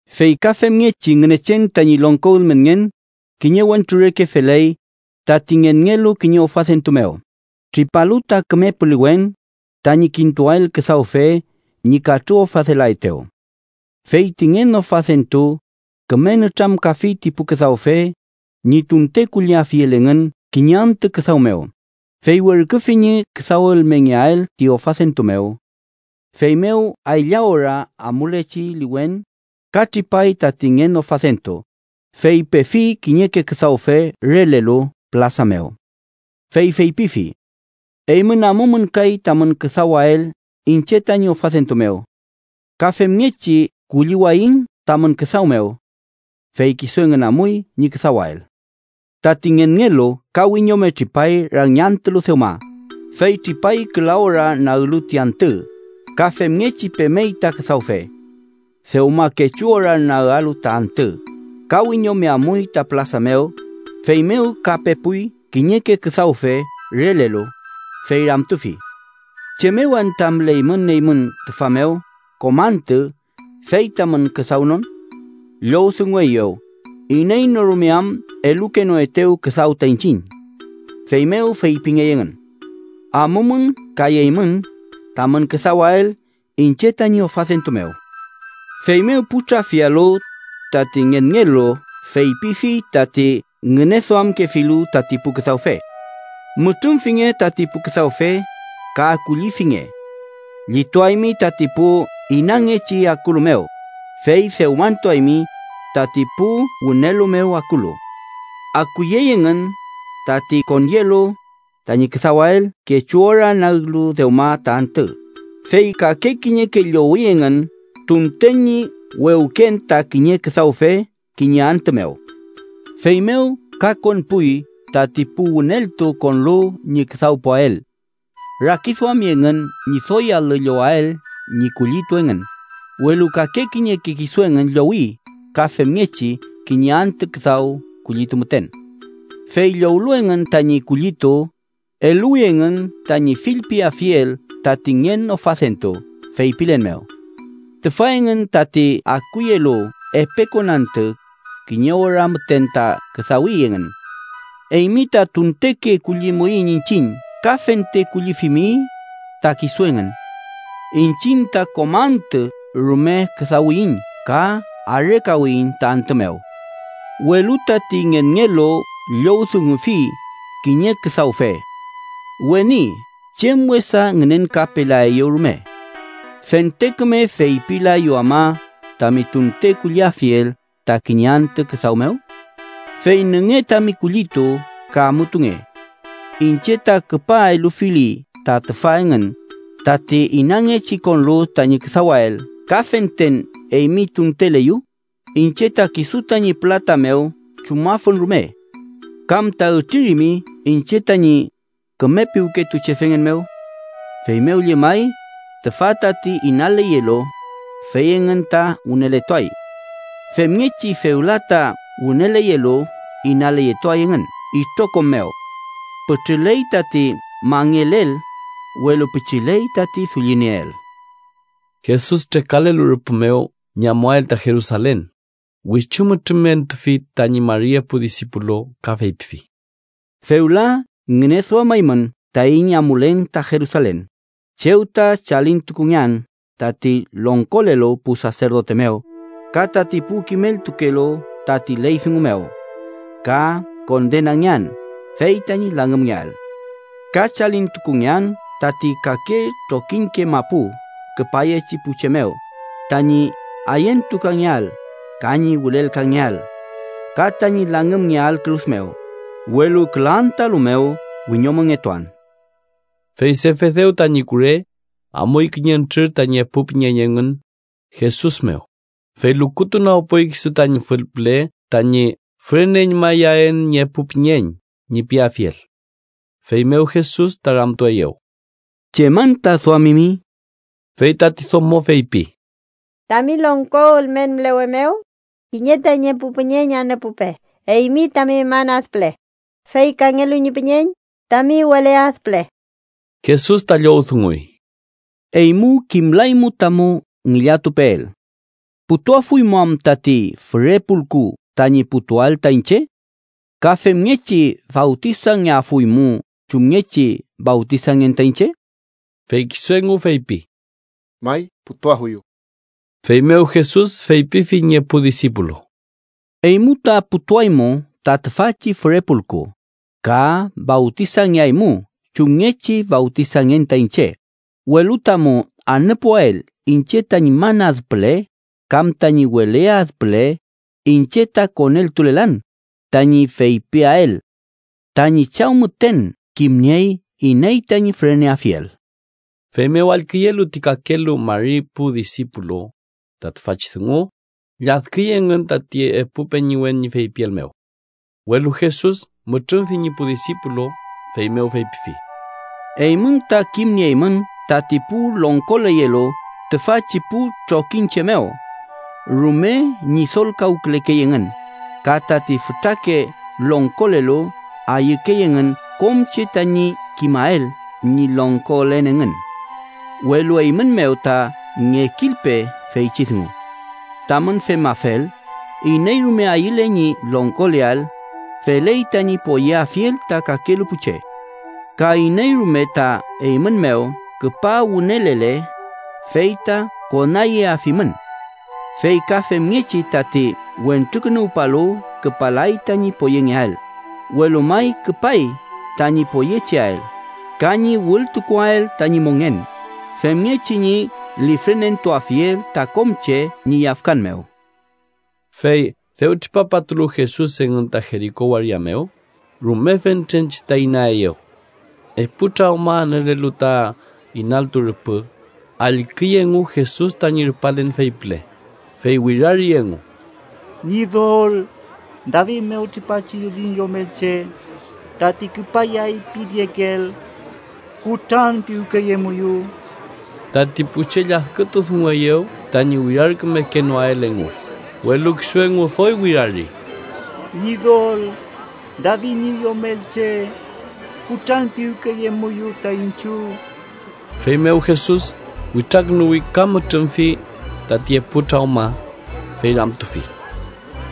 “Fey ka femngechi Ngünechen tañi longko ülmenngen kiñe wentru reke feley tati ngenngelu kiñe ofadentu mew, tripalu ta küme puliwen tañi kintuael küdawfe ñi katrüofadelaetew. Fey ti ngen ofadentu küme nütramkafi ti pu küdawfe ñi tunten kulliafiel engün kiñe antü küdaw mew, fey werküfi ñi küdawelmengeael ti ofadentu mew. “Feymew aylla ora amulechi liwen ka tripay tati ngen ofadentu, fey pefi kiñeke küdawfe relelu pülasa mew. Fey feypifi: ‘Eymün amumün kay tamün küdawael iñche tañi ofadentu mew. Ka femngechi kulliwayiñ tamün küdaw mew.’ Fey kisu engün amuy ñi küdawael. “Tati ngenngelu ka wiñome tripay rangiantülu dewma, fey tripay küla ora naglu ti antü, ka femngechi pemey ta küdawfe. Dewma kechu ora naglu ta antü, ka wiñome amuy ta pülasa mew, feymew ka pepuy kiñeke küdawfe relelu, fey ramtufi: ‘¿Chem mew anta müleymün eymün tüfa mew kom antü fey tamün küdawnon?’ Llowdungungey: ‘Iney no rume am elukenoetew küdaw ta iñchiñ.’ Feymew feypingey engün: ‘Amumün kay eymün tamün küdawael iñche tañi ofadentu mew.’ “Feymew pu trafialu, tati ngenngelu feypifi tati ngüneduamkefilu tati pu küdawfe: ‘Mütrümfinge tati pu küdawfe, ka kullifinge. Llituaymi tati pu inangechi akulu mew, fey dewmantuaymi tati pu wünelu mew akulu.’ Akuyey engün, tati konyelu tañi küdawael kechu ora naglu dewma ta antü, fey kake kiñeke llowi engün tunteke ñi wewken ta kiñe küdawfe kiñe antü mew. Feymew ka konpuy tati pu wüneltu konlu ñi küdawpuael. Rakiduami engün ñi doy alü llowael ñi kullitu engün, welu kake kiñeke kisu engün llowi ka femngechi kiñe antü küdaw kullitu müten. Fey llowlu engün tañi kullitu, eluwi engün tañi fillpiafiel tati ngen ofadentu, feypilen mew: ‘Tüfa engün, tati akuyelu epe konantü, kiñe ora müten ta küdawi engün. Eymi ta tunteke kullimuiñ iñchiñ ka fente kullifimi ta kisu engün. Iñchiñ ta kom antü rume küdawiyiñ ka arekawiyiñ ta antü mew.’ “Welu tati ngenngelu llowdungufi kiñe küdawfe: ‘Weni, chem wesa ngünenkapelaeyu rume. ¿Fente küme feypiwlayu ama tami tunte kulliafiel ta kiñe antü küdaw mew? Fey nünge tami kullitu ka amutunge. Iñche ta küpa elufili ta tüfa engün tati inangechi konlu tañi küdawael ka fenten eymi tunteleyu, iñche ta kisu tañi pülata mew chumafun rume. ¿Kam ta ütririmi iñche tañi küme piwketuchefengen mew?’ “Feymew llemay tüfa tati inalelu, fey engün ta wüneletuay. Femngechi fewla ta wüneleyelu, inaleyetuay engün itrokom mew. Pütrüley tati mangelel, welu pichiley tati dullinieel.” Jesus trekalelu rüpü mew ñi amuael ta Jerusalen, wichu mütrümentufi tañi mari epu disipulu ka feypifi: —Fewla ngüneduamaymün taiñ amulen ta Jerusalen, chew ta chalintukungean tati longkolelu pu saserdote mew ka tati pu kimeltukelu tati ley dungu mew, ka kondenangean fey tañi langümngeael. Ka chalintukungean tati kake trokiñke mapu küpayechi pu che mew tañi ayentukangeael ka ñi wülelkangeael ka tañi langümngeael kürus mew, welu küla antüalu mew wiñomongetuan. Fey Sefedew tañi kure amuy kiñentrür tañi epu püñeñ engün Jesus mew, fey lukutunagpuy kisu tañi fül püle tañi “füreneñmayaen ñi epu püñeñ” ñi piafiel. Feymew Jesus ta ramtueyew: —¿Chem anta duamimi? Fey tati domo feypi: —Tami longko ülmen mülewe mew kiñe tañi epu püñeñ anüpupe eymi tami man ad püle, fey kangelu ñi püñeñ, tami wele ad püle. Jesus ta llowdunguy: —Eymu kimlaymu tamu ngillatupeel. ¿Putuafuymu am tati füre pulku tañi putuael ta iñche? ¿Ka femngechi fawtisangeafuymu chumngechi fawtisangen ta iñche? Fey kisu engu feypi: —May, putuafuyu. Feymew Jesus feypifi ñi epu disipulu: —Eymu ta putuaymu ta tüfachi füre pulku, ka fawtisangeaymu chumngechi fawtisangen ta iñche, welu tamu anüpuael iñche tañi man ad püle kam tañi wele ad püle iñche ta koneltulelan tañi feypiael. Tañi Chaw müten kimniey iney tañi füreneafiel. Feymew allküyelu ti kakelu mari pu disipulu ta tüfachi dungu, lladküy engün tati epu peñiwen ñi feypiel mew. Welu Jesus mütrümfi ñi pu disipulu, feymew feypifi: —Eymün ta kimnieymün tati pu longkoleyelu tüfachi pu trokiñche mew rume ñidolkawkülekey engün, ka tati fütrake longkolelu ayükey engün kom che tañi kimael ñi longkolen engün. Welu eymün mew ta ngekilpe feychi dungu. Tamün femafel, iney rume ayüle ñi longkoleael, feley tañi poyeafiel ta kakelu pu che. Ka iney rume ta eymün mew küpa wünelele, fey ta konayeafimün. Fey ka femngechi tati Wentrukünuwpalu küpalay tañi poyengeael, welu may küpay tañi poyecheael, ka ñi wültukuael tañi mongen femngechi ñi lifrenentuafiel ta kom che ñi yafkan mew. Fey dew tripapatulu Jesus engün ta Jeriko waria mew, rume fentren che ta inaeyew. Epu trawma anülelu ta inaltu rüpü, allküy engu Jesus tañi rupalen fey püle, fey wirari engu: —¡Ñidol, David mew tripachi dullin Yomelche tati küpayay piniekeel, kutranpiwkeyemuyu! Tati pu che lladkütu dungueyew tañi wirarkümekenoael engu, welu kisu engu doy wirari: —¡Ñidol, David ñi Yomelche, kutranpiwkeyemuyu ta iñchiw! Feymew Jesus witrakünuwi ka mütrümfi tati epu trawma, fey ramtufi: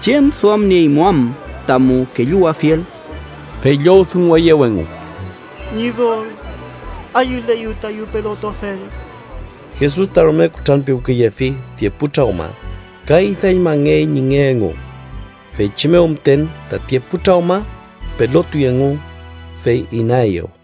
—¿Chem duamnieymu am tamu kelluwafiel? Fey llowdungueyew engu: —Ñidol, ayüleyu tayu pelotuafel. Jesus ta rume kutranpiwkeyefi ti epu trawma, ka idañmangey ñi nge engu. Feychi mew müten tati epu trawma pelotuy engu, fey inaeyew.